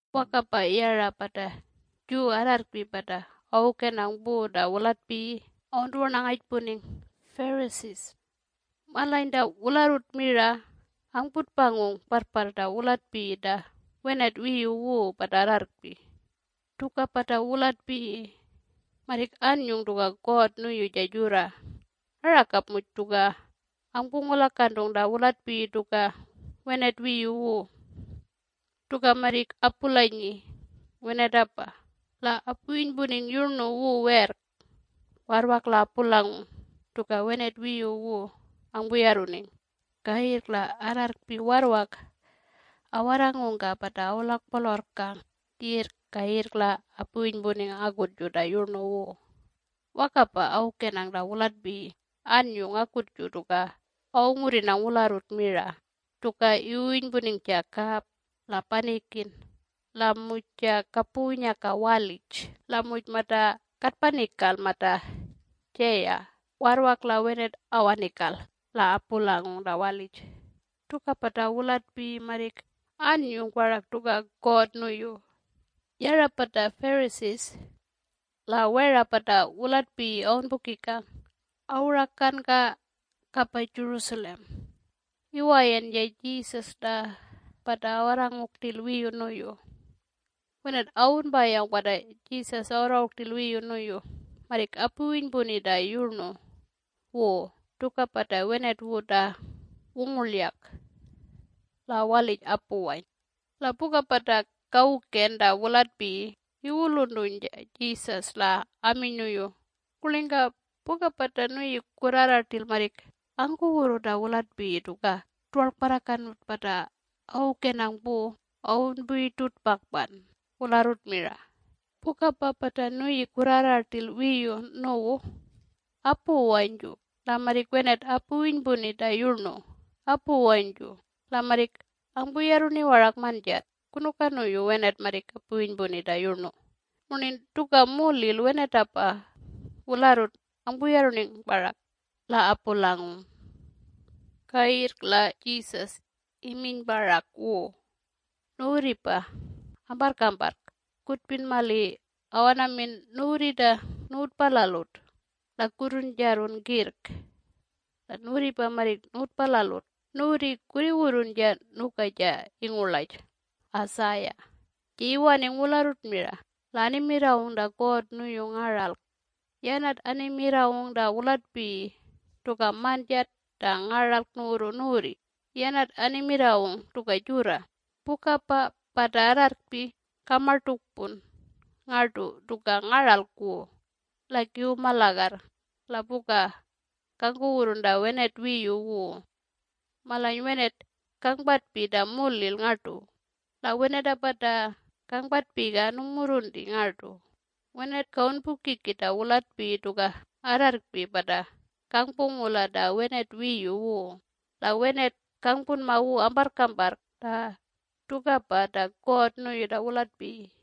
Wakapa yara pata Jew arrarrkpi pata awukenang pu ta wulatpiyi awuntuwarnangajpuning Pharisees. Malany ta wularrut mira angputpangung parrparr ta wulatpiyi ta wenat wiyu wu pata arrarrkpi. Tukapa ta wulatpiyi marrik annyung tuka God nuyu ja jurra. Arakap muj tuka angpungulakantung ta wulatpiyi tuka wenat wiyu wu: Tuka marrik apulanyi wenatapa la apuwinypuning yurnu wu werrk warrwak la apulangung tuka wenat wiyu wu angpuyarruning. Kayirrk la arrarrkpi warrwak awarrangungka pata awulakpolorrkang yirrk kayirrk la apuwinypuning akutju ta yurnu wu. Wakapa awukenang ta wulatpiyi anyung akutju tuka awungurrinang wularrut mira, tuka iwuwinypuning ja kap, la panikin, la muj ja kapuwunyaka walij la muj mata katpani kal mata jaya warrwak la wenat awaning kal la apulangung ta walij. Tukapa ta wulatpiyi marrik anyung parak tuka God nuyu. Yara pata Pharisees, la wera pata wulatpiyi awunpukikang, awuranka kapa Jerusalem iwayan ja Jesus la pata awarrangung rtil wiyu nuyu. Wenat awunpayawng pata Jesus awarrangung rtil wiyu nuyu marrik apuwinypuni ta yurnu wu tukapa ta wenat wu ta wungurlyak la walij apuwany la puka pata kawuken ta wulatpiyi iwuluntuny ja Jesus la aminy nuyu, “Kurlingka puka pata nuyi kurrarra rtil marrik angkuwurru ta wulatpiyi tuka tuwarlkparrakanut pata awukenang pu awunpuyurtutpakpan wularrut mira? Pukapa pata nuyi kurrarra rtil wiyu nuwu apuwanyju la marrik wenat apuwinypuni ta yurnu apuwanyju la marrik angpuyarruni warak manjat. Kunuka nuyu wenat marrik apuwinypuni ta yurnu murnin tuka mulil wenatapa wularrut angpuyarruning parak la apulangung?” Kayirrk la Jesus iminy parak wu, “Nuwurripa amparrkamparrk kutpin mali awanamin nuwurri ta nuwutpalalut la kurrungpurrun kirrk, la nuwurripa marrik nuwutpalalut. Nuwurri kurriwurrun ja nuka ja ingurlaj Isaiah ja iwaning wularrut mira la animirrawung ta God nuyu ngaralk, yanat animirrawung ta wulatpiyi tuka manjat ta ngaralk nuwurru nuwurri. Yanatapa animirrawung tuka jurra, ‘Pukapa pata arrarrkpi kamartukpun ngartu tuka ngaralk wu la kiwuma lagarr la puka kangkuwurrun ta wenat wiyu wu. Malany wenat kangpatpi ta mulil ngartu, la wenatapa ta kangpatpiga nungmurrunti ngartu. Wenat kawunpukiki ta wulatpiyi tuka arrarrkpi pata kangpungula ta wenat wiyu wu, la wenat kangpunma wu amparrkamparrk ta tukapa ta God nuyu ta wulatpiyi.’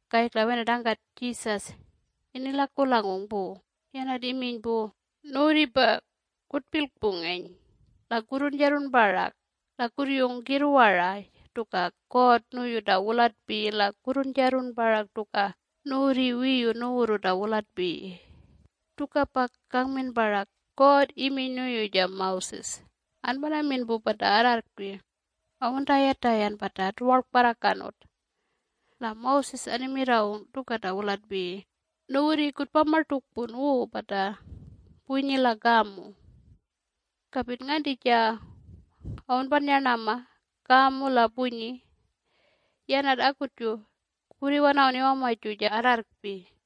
Kayirrk la wenat angkat Jesus inilakulangung pu, yanat iminy pu, “Nuwurripa kutpilkpungen la kurrunjarrun parak la kurryun kirrwara tuka God nuyu ta wulatpiyi la kurrunjarrun parak tuka nuwurri wiyu nuwurru ta wulatpiyi. Tukapa kangmin parak: God iminy nuyu ja Moses, ‘Anpanamin pu pata arrarrkpi awuntayatayan pata tuwarlkparrakanut.’ La Moses animirrawung tuka ta wulatpiyi: ‘Nuwurri kutpamartukpun wu pata punyi la kamu. Kapin nganti ja awunpannyarnama kamu la punyi, yanat akutju kurriwanawun iwamaju ja arrarrkpi!’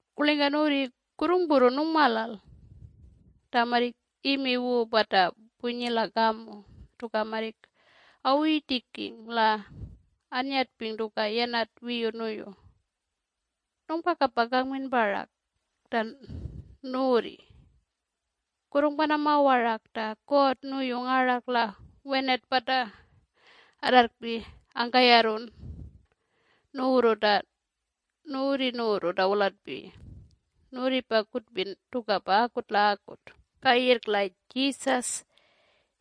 Kurlingka nuwurri kurrungpurrun nungmalal ta marrik imi wu pata punyi la kamu tuka marrik awuyitiking la annyatping tuka yanat wiyu nuyu? Nungpakapa kangmin parak ta nuwurri kurrungpanama warak ta God nuyu ngaralk la wenat pata arrarrkpi angkayarrun nuwurru ta nuwurri nuwurru ta wulatpiyi. Nuwurripa kutpin tukapa akut la akut.” Kayirrk la Jesus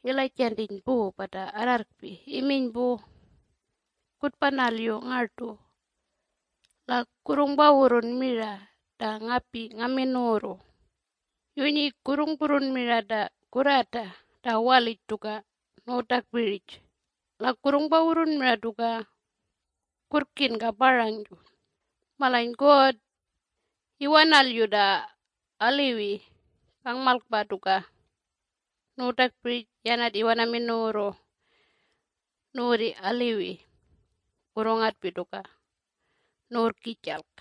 ilajantiny pu pata arrarrkpi iminy pu, “Kutpanalyu ngartu la kurrungpawurrun mira ta ngapi ngamin nuwurru. Yunyi kurrungpurrun mira ta kurrata ta walij tuka nuwutakpirij la kurrungpawurrun mira tuka kurrkinka parangju. Malany God iwanalyu ta aliwi kangmalkpa tuka nuwutakpirij yanat iwanamin nuwurru nuwurri aliwi kurrungatpi tuka nuwurrkijalk.”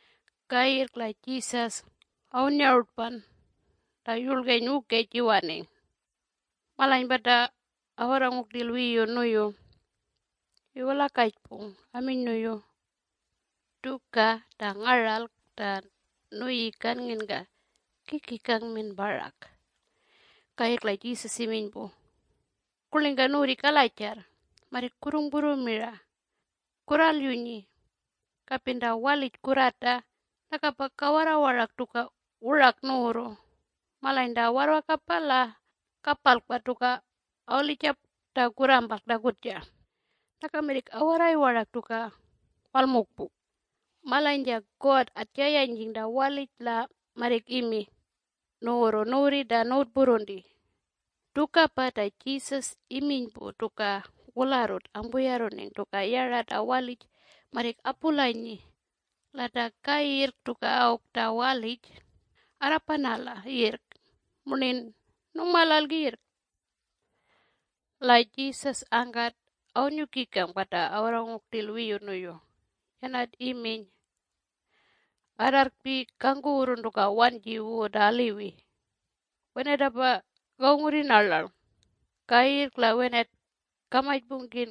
Kayirrk la Jesus awunnyarutpan la yurlgeny wukej iwaning. Malany pata awarrangung rtil wiyu nuyu iwulakajpung aminy nuyu, “Tuka ta ngaralk ta nuyi kannginka kiki kangmin parak?” Kayirrk la Jesus iminy pu, “Kurlingka nuwurri kalajarr marrik kurrungpurru mira? Kurralyunyi, kapin ta walij kurrata nakapa kawarra warak tuka wurak nuwurru malany ta warrwakapa la kapalkpa tuka awalijap ta kurrampalk ta kutja. Naka marrik awarray warak tuka walmukpuk. Malany ja God atjayanyjing ta walij la marrik imi nuwurru nuwurri ta nuwutpurrunti.” (Tukapa ta Jesus iminy pu tuka wularrut angpuyarruning tuka yara ta walij marrik apulanyi la ta kayirrk tuka awk ta walij arrapanala yirrk murnin nungmalal yirrk.) La Jesus angkat awunnyukikang pata awarrangung rtil wiyu nuyu, yanat iminy, “Arrarrkpi kangkuwurrun tuka wanji wu ta aliwi wenatapa kawungurrin arlalng - kayirrk la wenat kamajpungkin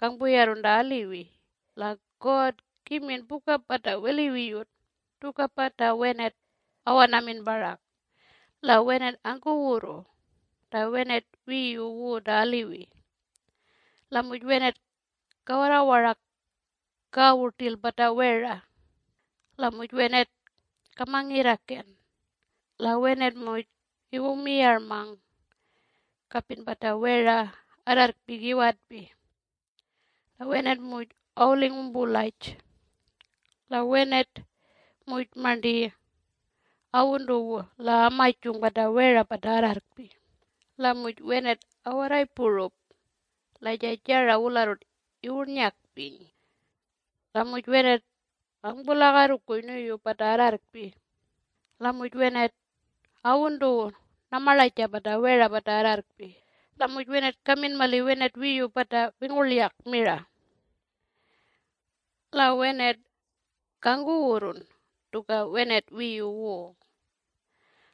kangpuyarrun ta aliwi - la God kimin puka pata weliwiyut. Tukapa ta wenat awanamin parak: La wenat angkawurru ta wenat wiyu wu ta aliwiyut. La muj wenat kawarra warak kawu rtil pata wera. La muj wenat kamangirrakan. La wenat muj iwumiyarmang kapin pata wera arrarrkpi kiwetpi. La wenat muj awuling wumpulaj. La wenat muj marnti awuntuwu la amajung pata wera pata arrarrkpi. La muj wenat awarray purup la ja jara wularrut iwurnyakpiny. La muj wenat angpularrukuy nuyu pata arrarrkpi. La muj wenat awuntuwu namarlaja pata wera pata arrarrkpi. La muj wenat kamin mali wenat wiyu pata wingurlyak mira. La wenat kangkuwurrun tuka wenat wiyu wu.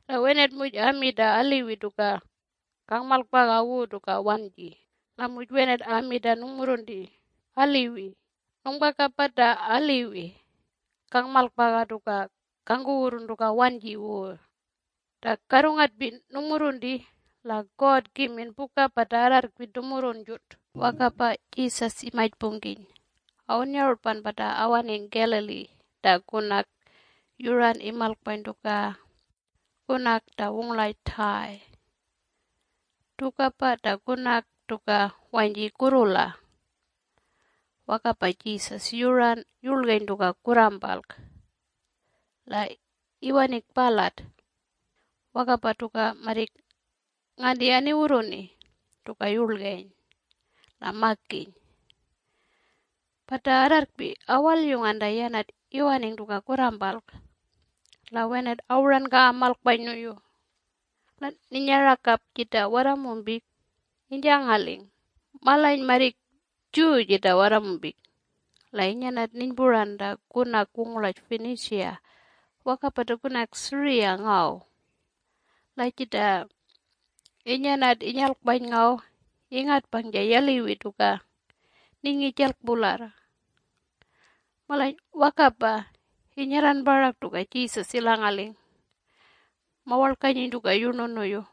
La wenat muj ami ta aliwi tuka kangmalkpaga wu tuka wanyji. La muj wenat ami ta nungmurrunti aliwi. Nungpakapa ta aliwiyut kangmalkpaga tuka kangkuwurrun tuka wanji wu. Ta karrungatpi nungmurrunti la God kimin puka pata arrarrkpi tumurrunjut.” Wakapa Jesus imajpungkiny awunnyarutpan pata awaning Galiliee ta kunak yuran imalkpany tuka kunak ta wungurlaj Tyre. Tukapa ta kunak tuka wanyji kurrula. Wakapa Jesus yuran yurlgeny tuka kurrampalk la iwaning palat wakapa tuka marrik nganti aniwurruni tuka yurlgeny la makiny. Pata arrarrkpi awalyungan ta yanat iwaning tuka kurrampalk la wenat awuranka amalkpany nuyu. La ninyarakap jita warramumpik inyjangaling. Malany marrik Jew jita warramumpik la inyanat ninypuran ta kunak wungurlaj Phoenecia wakapa ta Syria ngaw. La jita inyanat inyalkpany ngaw ingatpang ja yaliwi tuka ninyngijalk pularr. Malany wakapa inyarran parak tuka Jesus ilangaling, mawalkanyiny tuka yurnu nuyu.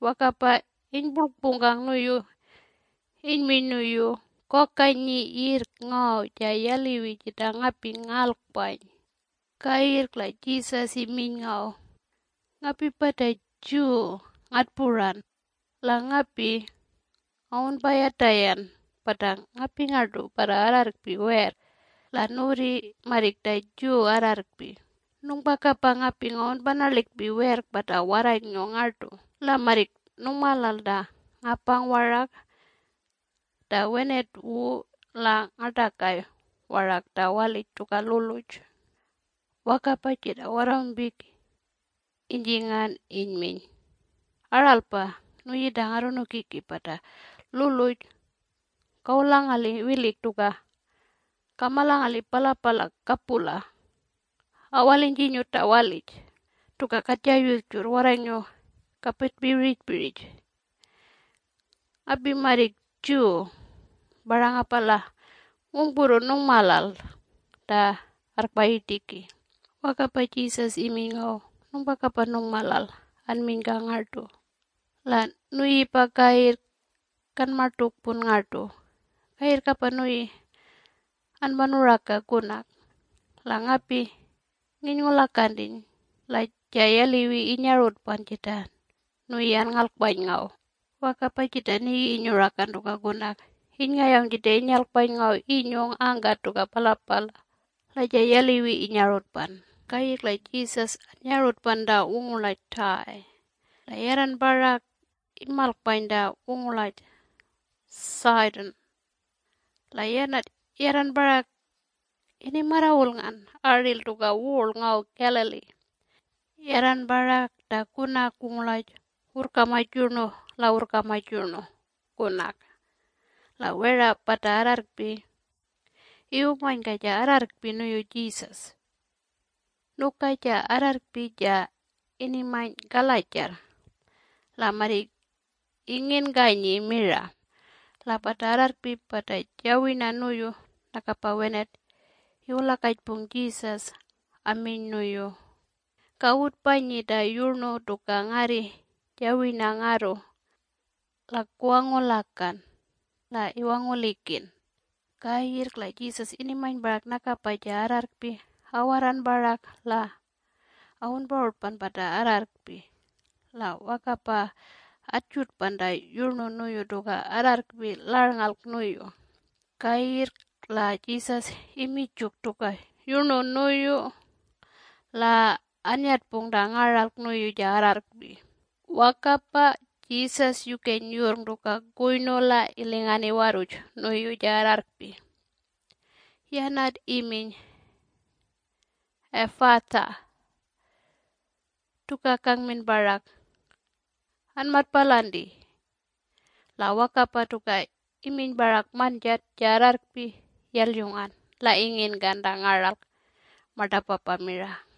Wakapa inypurlkpungkang nuyu inyminy nuyu, “Kokanyi yirrk ngaw ja yaliwi jita ngapi ngalkpany!” Kayirrk la Jesus iminy ngaw, “Ngapipa ta Jew ngatpuran. La ngapi ngawunpayatayan pata ngapi ngartu pata arrarrkpi werrk, la nuwurri marrik ta Jew arrarrkpi. Nungpakapa ngapi ngawunpanalikpi werrk pata warranyngiw ngartu. La marrik nungmalal ta ngapang warak ta wenat wu la ngartakay warak ta walij tuka luluj.” Wakapa jita warramumpik inynginkan inyminy, “Aralpa, nuyi ta Ngarrunukiki. Pata luluj kawulangali wilik tuka kamalangali palapala kapula awalinyjinyut ta walij. Tuka katja yurrjurr warranyngiw kapatpi wirijpirij. Ngapi marrik Jew parangapa la ngungpurrun nungmalal ta arrkpayirtiki.” Wakapa Jesus iminy ngaw, “Nungpakapa nungmalal anminyka ngartu. La nuyipa kayirrk kanmartukpun ngartu. Kayirrkapa nuyi anpanuraka kunak. La ngapi nginyngulakantiny la ja yaliwi inyarutpan jita nuyi anngalkpany ngaw.” Wakapa jita nigi inyurakan tuka kunak inyngayawng jita inyalkpany ngaw inyung angkat tuka palapala la ja yaliwi inyarutpan. Kayirrk la Jesus annyarutpan ta wungurlaj Tyre la yarran parak imalkpany ta wungurlaj Sidon, la yanat yarran parak inimarrawulngan aril tuka wurl ngaw Galilee yarran parak ta kunak wungurlaj ‘Wurrkamaj Yurnu la Wurrkamaj Yurnu Kunak’. La wera pata arrarrkpi iwumanyka ja arrarrkpi nuyu Jesus. Nuka ja arrarrkpi ja inimany kalajarr la marrik inginkanyi mira. La pata arrarrkpi pata jawirna nuyu nakapa wenat iwulakajpung Jesus aminy nuyu, “Kawutpanyi ta yurnu tuka ngarri jawirna ngarru la kuwangulakan la iwangulikin.” Kayirrk la Jesus inimany parak nakapa ja arrarrkpi awarran parak la awunparutpan pata arrarrkpi la wakapa atjutpan ta yurnu nuyu tuka arrarrkpi larnngalk nuyu. Kayirrk la Jesus iminy juk tuka yurnu nuyu la anyatpung ta ngaralk nuyu ja arrarrkpi. Wakapa Jesus yukeny yurrng tuka kuynu la ilingan iwarruj nuyu ja arrarrkpi. Yanat iminy, “Ephphatha!” tuka kangmin parak, “Anmatpalanti!” La wakapa tuka iminy parak manjat ja arrarrkpi yalyungan la inginkan ta ngaralk martapapa mira.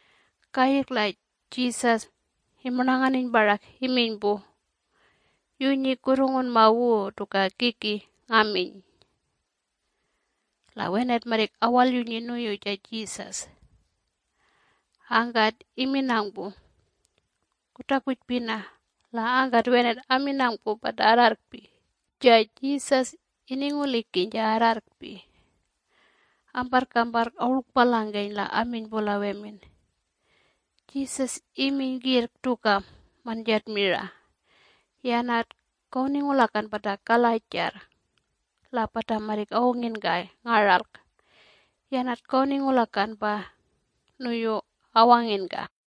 Kayirrk la Jesus imurnanganiny parak iminy pu, “Yunyi kurrungunma wu tuka kiki ngaminy.” La wenat marrik awalyunyi nuyu ja Jesus. Angkat iminang pu, “Kutakujpina!” la angkat wenat aminang pu pata arrarrkpi, “Ja Jesus iningulikiny ja arrarrkpi.” Amparrkamparrk awurlkpalangkeny la aminy pu la wemin, “Jesus iminy kirrk tuka manjat mira. Yanat kawuningulakan pata kalajarr la pata marrik awunginkay ngaralk - yanat kawuningulakan pa nuyu awanginka.”